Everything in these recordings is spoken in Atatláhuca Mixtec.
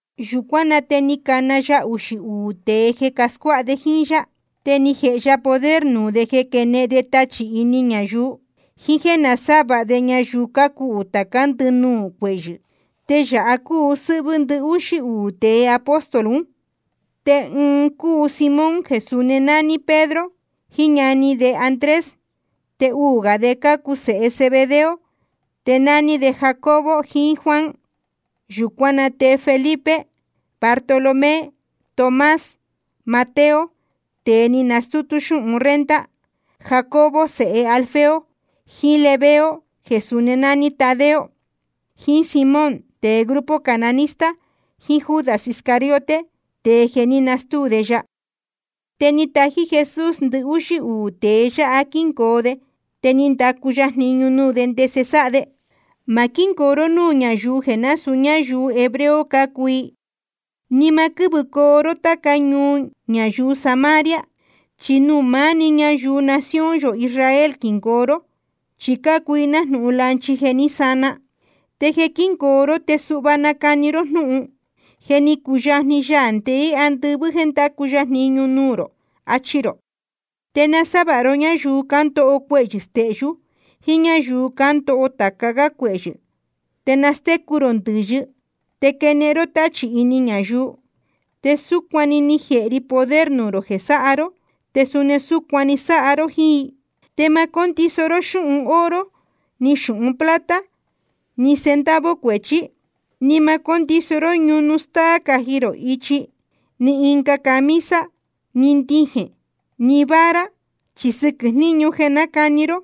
Yūcuán na te ni cana ya uxī uū tēe jeē scuáha de jíín yá. Te ni jēhe ya poder nuū de jeē quenehen de tachī ini ñayuu, jiín jéē nasávāha de ñayuu cácuhū tācá ndɨnuū cuehyɨ̄. Te yāha cúu sɨ́hvɨ́ ndɨhúxí uū tēe apóstol un: Tēe ɨɨn cúu Simón jeē suni nání Pedro, jiín ñani de Andrés. Te uū gā de cácuu sēhe Zebedeo, te nání de Jacobo jiín Juan. Yūcuán na te Felipe, Bartolomé, Tomás, Mateo tēe ni stútú xúhun renta, Jacobo sēhe Alfeo, jiín Lebeo jeē suni nání Tadeo, jiín Simón tēe grupo cananista, jiín Judas Iscariote, tēe jeē ní nastúu de ya. Te ni tají Jesús ndɨhúxí uū tēe yáha jeē quíngoo de. Te ni ndacu ya jniñu nuū de ndese sáha de: Ma quíngoo ró núū ñáyuu jeē násūu ñáyuu hebreo cácuu i, ni ma quɨ́vɨcoo ró táca ñuu ñayuu Samaria. Chi nuū maá‑ni ñayuu nación yō Israel quingoo ró, chi cácuu i nájnūhun lanchi jeē ní sana. Te jeē quíngoo ró te suhva nacani ró jnúhun: Je ni cuyajni Yaā ndeé andɨvɨ́ jeē ndacu ya jniñu nuū rō, achi rō. Te nasávāha ró ñáyuu cándoho cuehyɨ̄ stehyú jiín ñáyuu cándoho tāca gá cuehyɨ̄, te nastécu rō ndɨ̄yɨ te quenehen ró táchī ini ñayuu. Te súcuan‑ni ni jēhe ri poder nuū rō jeē sáha ró, te suni súcuan‑ni sáha ró jíín i. ’Te ma cóndiso ró xúhun oro, ni xūhun plata, ni centavo cuechí. Ni ma cóndiso ró ñunu stáá caji rō ichi, ni ɨnga camisa, ni ndijēn, ni vara. Chi sɨquɨ̄ jniñu jeē nácani ró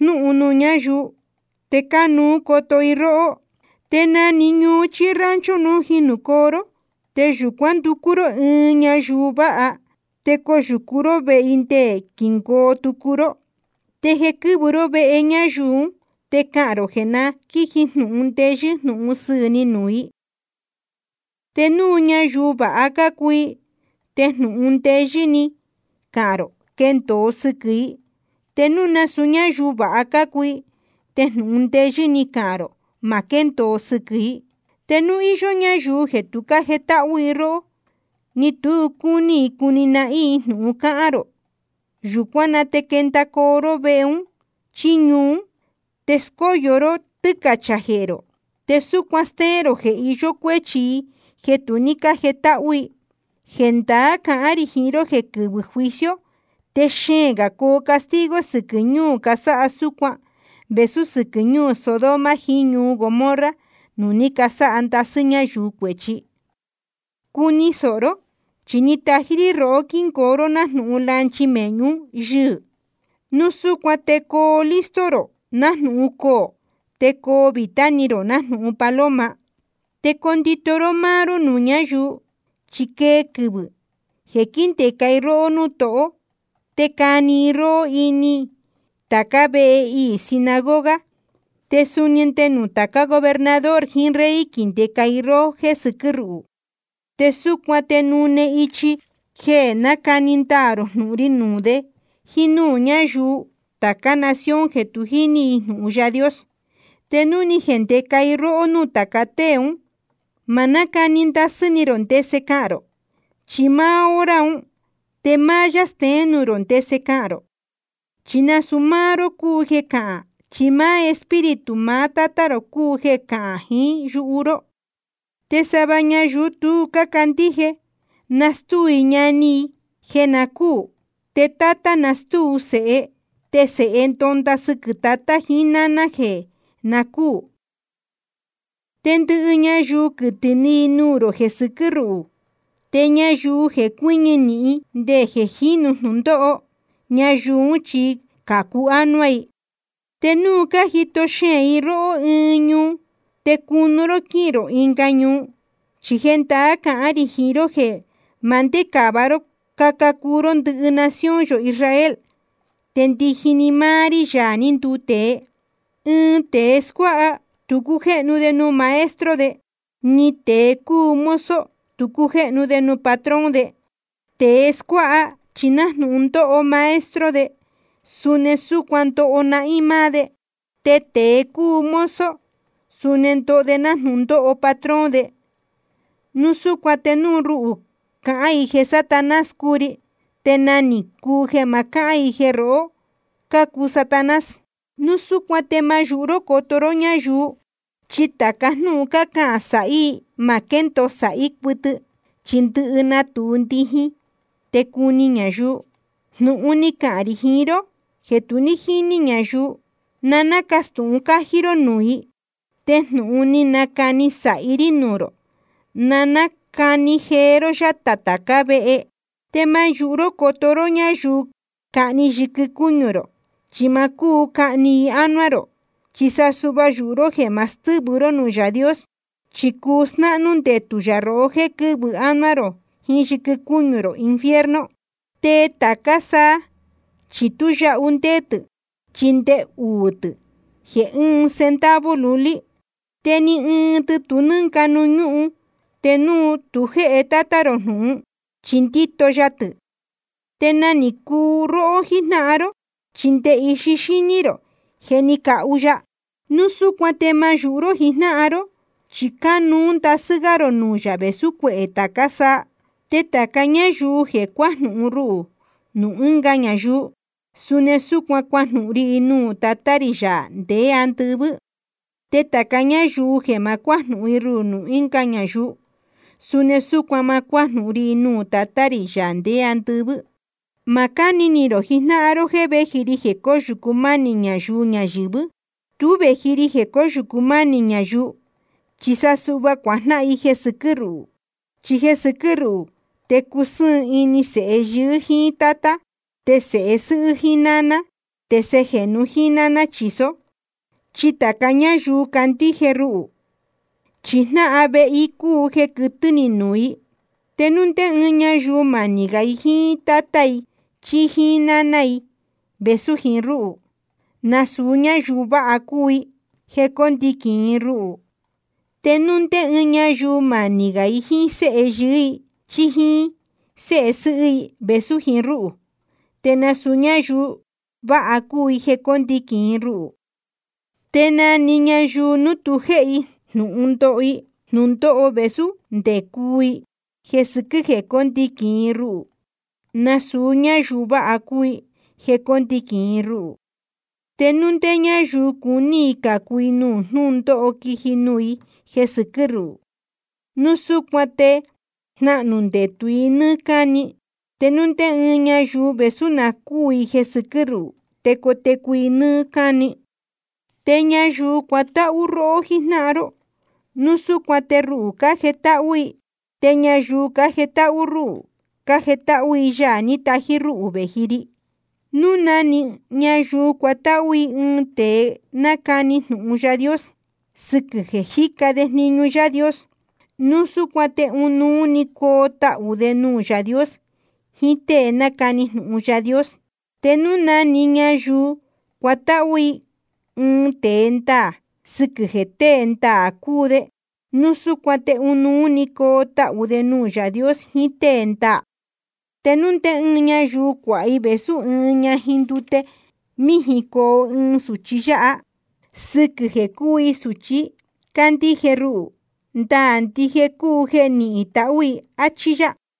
jnúhun nuū ñáyuu, te cánuú coto i róhó. ’Te na‑ni ñuu chí rancho núu ni jinūcoo ró, te yūcuán nducú ró ɨɨn ñayuu vāha, te coyūcu ró vehe i nde quingoo tucu ró. Te jeē quɨ́vɨ ró vehe ñayuu ún, te cahān rō jeē na quíji jnūhun ndeyɨ́ jnūhun sɨɨ̄ ni nuū i. Te núu ñayuu vāha cácuu i, te jnūhun ndeyɨ́ ní cahān rō quendōo sɨquɨ̄ i. Te núu nasūu ñáyuu vāha cácuu i, te jnūhun ndeyɨ́ ní cahān rō ma quéndōo sɨquɨ̄ i. Te núu íyó ñáyuu jeē tu cájetáhú i róhó, ni tu cúní i cuni nahín i jnūhun cahān rō, yūcuán na te quendacoo ró vehe un chí ñuu ún, te scóyo ró tɨ́cachā jehē rō, te súcuan stéén rō jeē iyó cuéchi i jeē tu ní cájetáhú i. Jendaá cahán rī jiín ró jeē quɨvɨ̄ juicio te xeēn gā coo castigo sɨquɨ̄ ñuu casáha súcuan vēsú sɨquɨ̄ ñuu Sodoma jiín ñuu Gomorra nuū ní casáha ndasɨ́ ñáyuu cuēchi. ’Cuni sōho ró, chi tájí rí rohó quíngoo ró nájnūhun lanchi mēhñu yɨ́hɨ̄. Núu súcuan te coo listo rō nájnūhun coō, te coo vītá ni rō nájnūhun paloma. Te condito ró máá ró nuū ñáyuu, chi quee quɨvɨ̄ jeē quíndeca i róhó núū tohó, te cani i róhó ini tācá vehe iī sinagoga. Te suni nde nuū tācá gobernador jiín rey quindeca i róhó jéē sɨquɨ́ ruhū. Te súcuan te nune ichi jeē nacani ndaā rō jnūhun ri nuū de jíín núū ñáyuu tācá nación jeē tu jíní jnūhun Yaā Dios. Te núu ni jendeca i róhó núū tāca tée ún, ma nácani ndasɨ́ ni rō ndese cahān rō. Chi máá hora un te máá yá steén nuū rō ndese cahān rō. Chi nasūu máá ró cúu jeē cahán, chi Espíritu maá Tátá rō cúu jeē cahán jiín yuhu ró. ’Te sava ñayuu tu cácandíje, nastúu i ñani i jeē na cúū. Te tátá nastúu sēhe. Te sēhe ndonda sɨquɨ̄ tatá jiín náná jeē na cúū. Te ndɨhɨ ñayuu quɨtɨ̄ ni i nuū rō jeē sɨquɨ́ ruhū. Te ñayuu jeē cuɨñɨ nīhin nde jeē jínu jnūndóho, ñayuu ún chi cācu ánuá i. Te núu cájito xeēn i róhó ɨɨn ñuu, te cunu ró quíhīn rō ɨnga ñuu. Chi jendaá cahán rī jiín ró jeē ma ndécāva ró caca cuu ró ndɨhɨ nación yō Israel te ndiji‑ni máá rí, Yaā ní nduu tēe. ’Ɨɨn tēe scuáha, tu cújéhnu de nuū maestro de. Ni tēe cúu mozo, tu cújéhnu de nuū patrón de. Tēe scuáha chi nájnūhun ndóho maestro de suni súcuan ndoho nahín máá de, te tēe cúu mozo suni ndoho de nájnūhun ndóho patrón de. Núu súcuan te núu ruhū cácahān i jeē Satanás cúu ri, te nagā ni cuu jeē ma cahán i jeē rohó cácuu Satanás. ’Núu súcuan te ma yūhu ró coto ró ñáyuu. Chi tāca jnúhun cácahān sāhí i ma quéndōo sāhí cuɨtɨ, chi ndɨhɨ natūu ndijin, te cuni ñayuu. Jnūhun ní cahān rī jiín ró jeē tu ní jíní ñayuu, na nácastūhun cájí ró nuū i. Te jnūhun ní nacani sāhi rí nuū rō, na nácani jee ró yátā tācá vehe. Te ma yūhu ró coto ró ñáyuu cahni yɨquɨ cúñu rō, chi ma cúu cahni i ánuá rō. Chi sa suhva yūhu ró jéē ma stɨ́vɨ ró núū Yaā Dios, chi cuu snáhnú ndetū yā rohó jéē quɨ́vɨ ánuá rō jiín yɨquɨ cúñu rō infierno. ’Te tācá saa chi tú yahu ndéé tɨ̄, chi nde uū tɨ̄ jeē ɨɨn centavo lulí. Te ni ɨɨn tɨ tu nɨ́nga nuū ñúhun te núu tu jéhe Tátá rō jnūhun, chi ndíto ya tɨ. Te nagā ni cuu róhó jíjnáhan ró, chi nde ndɨhɨ ixi xíní rō je ni cahu ya. Núu súcuan te ma yūhu ró jijnáhan ró, chi cánuú ndasɨ́ gá rō nuū yā vēsú cuehē tācá saa. ’Te tāca ñáyuu jeē cuajnúhún rúhū nuū ɨnga ñayuu, suni súcuan cuajnúhún rí i nuū Tatá rī, Yaā ndeé andɨvɨ́. Te tāca ñáyuu jeē ma cuájnúhún rúhū nuū ɨnga ñayuu, suni súcuan ma cuájnúhún rí i nuū Tatá rī, Yaā ndeé andɨvɨ́. ’Ma cáni ni rō jijnáhan ró jéē véji ri jeē cóyūcu mánī ñayuu ñayɨ̄vɨ́. Tú vēji ri jeē cóyūcu mánī ñayuu, chi sa suhva cuajnáhan i jeē sɨquɨ́ ruhū. Chi jeē sɨquɨ́ ruhū te cusɨ́ɨn ini sēhe yɨɨ́ jíín tátá, te sēhe sɨ́hɨ́ jíín náná, te sēhe jēnu jíín náná chīsó. Chi tāca ñáyuu candíje ruhū, chi jnáhan vehe i cúu jeē quɨtɨ̄ ni nuū i. ’Te núu ndé ɨɨn ñayuu manī gā i jíín tátá i chí jíín náná i vēsú jiín rúhū, nasūu ñáyuu vāha cúu i jeē cóndiquīn i ruhū. Te núu ndé ɨɨn ñayuu manī gā i jíín séhe yɨɨ́ i chí jíín séhe sɨ́hɨ́ i vēsú jiín rúhū, te suni nasūu ñáyuu vāha cúu i jeē cóndiquīn i ruhū. Te na‑ni ñayuu núu tu jéhe i jnūhun ndoho i jnūndóho vēsú nde cuu i jeē sɨquɨ́ jeē cóndiquīn i ruhū, nasūu ñáyuu vāha cúu i jeē cóndiquīn i ruhū. Te núu ndé ñáyuu cúní i cācu i nuū jnúndóho quiji nuū i jeē sɨquɨ́ ruhū, núu súcuan te jnahnū ndetū i nɨ́ɨ́ cáni. Te núu ndé ɨɨn ñayuu vēsú na cúū i jeē sɨquɨ́ ruhū, te cotecu i nɨ́ɨ́ cáni. ’Te ñayuu cuatáhú róhó jijnáhan ró, núu súcuan te ruhū cájetáhú i. Te ñayuu cájetáhú rúhū, cájetáhú i Yaā ní tají rúhū vēji ri. Núu na‑ni ñayuu cuatáhú i ɨɨn tēe nácani jnūhun Yaā Dios, sɨquɨ̄ jeē jíca de jniñu Yaā Dios, núu súcuan te ɨnuú‑ni coo tahū de nuū Yaā Dios jiín tée nácani jnūhun Yaā Dios. Te núu na‑ni ñayuu cuatáhú i ɨɨn tēe ndaā, sɨquɨ̄ jeē tēe ndaā cúu de, núu súcuan te ɨnuú‑ni coo tahū de nuū Yaā Dios jiín tée ndaā. Te núu ndé ñáyuu cuāha i vēsú ɨɨn ñajin ndute míjin coho ɨɨn sūchi yáha, sɨquɨ̄ jeē cúu i sūchi cándíje ruhū, ndaā ndije cúu jeē nihín i tahū i. Achí yá.